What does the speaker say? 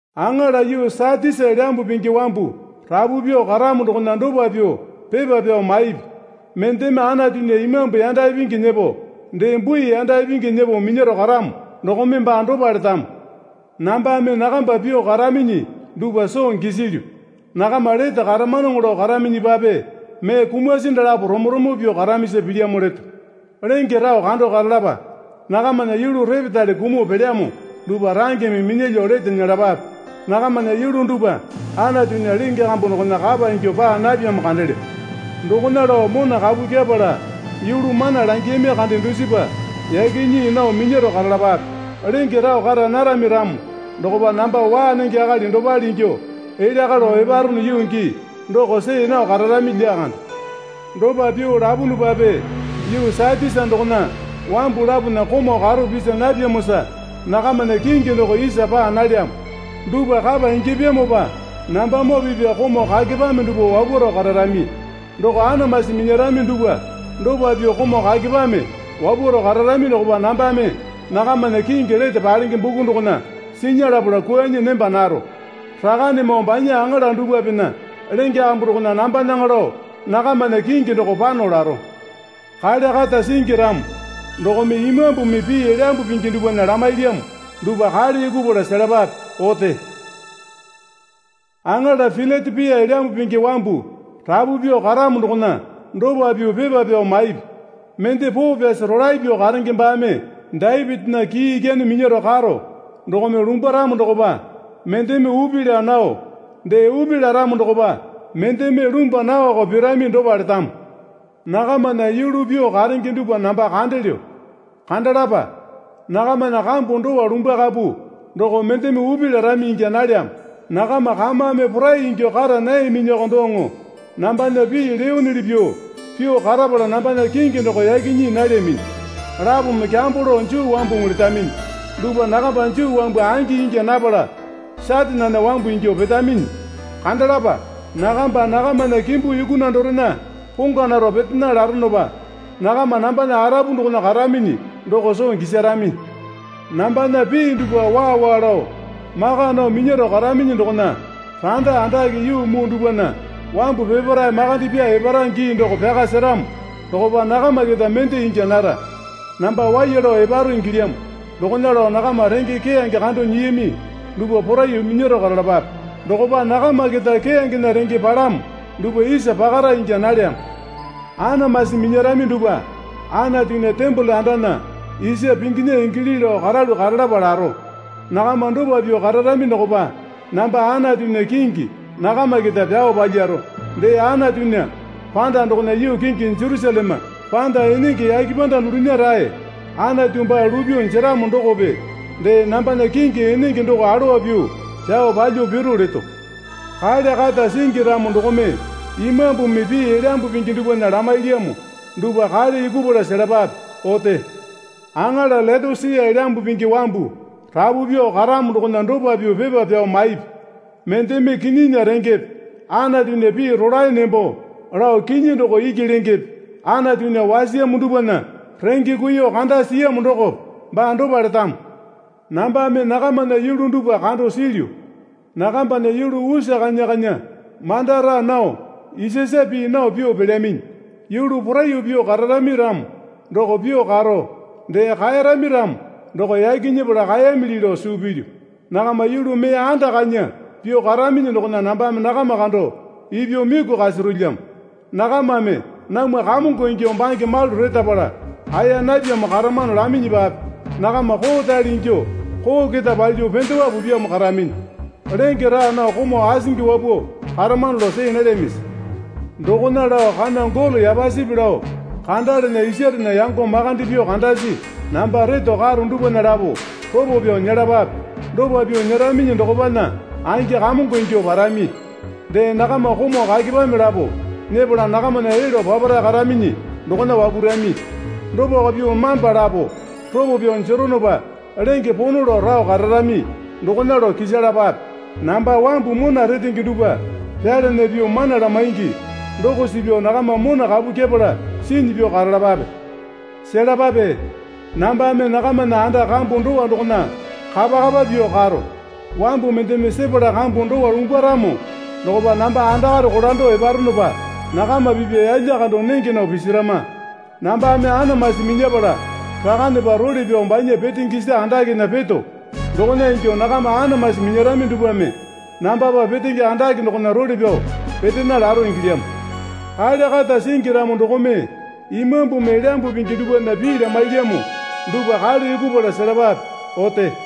Aŋala yuu Satisa Elyambu Pingi wambu rapu pyuo karamo dokona dopa pyuo pepa pyao maipi. Mendeme Anatunya Imambu yanda ipingi nyepo dee bui yanda ipingi nyepo minyaro karamo dokome baa dopa letamo. Nambame nakamba pyuo karaminyi dupwa soo gisilyu. Nakama lete karamanoŋo lao karaminyipape mee kumasi dalapo romo romo pyuo karamisa pilyamo leto. Lenge rao kandao karalapa. Nakamana yulu repetale kumuo pelyamo dupwa rangeme minyalyuo lete nyelapape. Nakamana yulu dupwa Anatunya lenge kambu dokona kapa ingyuo paa napyamo kandelyo. Dokona lao mona kapu kyepala yulu mana langiyami kande dusipa yaki nyii nao minyaro karalapape. Lenge rao kara narami ramo dokopa namba waa nenge akali dopale ingyuo elya kalo eparono yuu gii doko see nao kararami lyakande. Dopa pyuo lapunupape yuu Satisa dokona wambu lapona komau karo pisa napyamosa nakamana kingi doko isa paa nalyamo. Dupwa kapa ingyapyamopa nambamoo pipya komau kakepame dupwa wapwaro kararami. Doko anamasi minyarami dupwa dopa pyuo komau kakepame wapwaro kararami dokopa nambame nakamana kingi lete palenge buku dokona sinya lapala kwuanyi nemba naro. Rakanemoo banya aŋala dupwapena lenge kambu dokona nambanaŋa lao nakamana kingi doko pano laro. Kale kata singi ramo dokome Imambumi pii Elyambu Pingi dupwana lamailyamo dupwa kale yukupala selapape. Ote. Aŋala Pilatepia Elyambu Pingi wambu rapu pyuo karamo dokona dopa pyuo pepa pyao maipi. Mende poo pyasi rolae pyuo karenge baame Dapitinya kii ikyane minyaro karo dokome lumbwaramo dokopa mendeme upi laa nao dee upi laramo dokopa mendeme lumbwa naoko pirami dopa letamo. Nakamana yulu pyuo karenge dupwa namba kandelyo. Kandalapa. Nakamana kambu dowa lumbwakapu doko mendeme upi larami ingya nalyamo. Nakama kamame porai ingyuo kara nayaminyiko doŋo nambana pii leyonuli pyuo pyuo karapala nambana kingi doko yaki nyii nalyaminyi. Lapome kyambo lao Juu wambuŋu letaminyi dupwa nakamba Juu wambu angi ingya napala Satanena wambu ingyuo petaminyi. Kandalapa. Nakamba nakamana kimbu yukuna dorena pongwa naro petena laronopa nakama nambana arapu dokona karaminyi doko soo gisarami. Nambana pii dupwa waa waa lao maka nao minyaro karaminyi dokona randa andake yuu muu dupwana wambu peparae makande pyaa epara gii doko pyaka seramo dokopa nakama keta mende ingya nara. Namba waiya lao eparo ingilyamo dokona lao nakama renge keyange kando nyiyami dupwa poraiyuo minyaro karalapape. Dokopa nakama keta keyangena renge palamo dupwa isa pakara ingya nalyamo. Anamasi minyarami dupwa Anatunya tembole andana isa pinginya ingili lao karalu karalapa laro. Nakama dopa pyuo kararami dokopa namba Anatunya kingi nakama keta pyao palyaro. Dee Anatunya panda dokona yuu kingi Jerusaleme panda enenge yake panda dulunya rae Anatu baa lupyuo jeramo dokope dee nambana kingi enenge doko alowa pyuo pyao palyuo piru leto. Kale kata singi ramo dokome Imambumi pii Elyambu Pingi dupwana lamailyamo dupwa kale yukupala selapape. Ote. Aŋala Leotosia Elyambu Pingi wambu rapu pyuo karamo dokona dopa pyuo pepa pyao maipi. Mendeme Kinyinya Rengepe Anatunya pii rolae nembo lao kinyi doko iki lengepe Antunya wasiyamo dupwana renge kuiyuo kanda siyamo dokope baa dopa letamo. Nambame nakamana yulu dupwa kando silyu. Nakambana yulu usa kanya kanya manda raa nao isasa pii nao pyuo pelyaminyi. Yulu poraiyuo pyuo kararami ramo doko pyuo karo, dee kaeyarami ramo doko yaki nyepala kaeyamili lao suu pilyu. Nakama yulu mee anda kanya pyuo karaminyi dokona nambame nakama kando ipyuo miku kasarolyamo. Nakamame, Namwa kamongo ingyuo bange malu retapala aeya napyamo karamano, laminyipape nakama koorale ingyuo, koo keta palyuo pendewa pupyamo karaminyi. Lenge raa nao komau asingi wapuo karamano lao see nalyamisi? Dokona lao kana golo yapasipi lao kandalana isarena yango makande pyuo kandasi namba reto karo dupwana lapo ropo pyao nyelapape. Dopa pyuo nyeraminyi dokopana angi kamongo ingyuo parami. Dee nakama komau kakepame lapo nyepala nakamana elyuo papara karaminyi dokona wapurami. Dopako pyuo mamba lapo ropo pyao jeronopa lenge pono lao rao kararami dokona lao kisalapape. Namba wamba mona retenge dupwa pyalana pyuo mana lamaingi doko suu pyao nakama mona kapu kyepala sinyi pyuo karalapape. Selapape. Nambame nakamana anda kambu dowa dokona kapakapa pyuo karo. Wambu mendeme sepala kambu dowa lumbwaramo dokopa namba andakare kolando eparonopa nakama pipya yalya kando nenge nao pisarama. Nambame anamasi minyapala Rakanepa role pyao banya petenge isa andakena peto dokona ingyuo nakama anamasi minyarami dupwame nambapa petenge andake dokona role pyao petena laro ingilyamo. Kale kata singi ramo dokome Imambumi Elyambu Pingi dupwana pii lamailyamo dupwa kale yukupala selapape. Ote.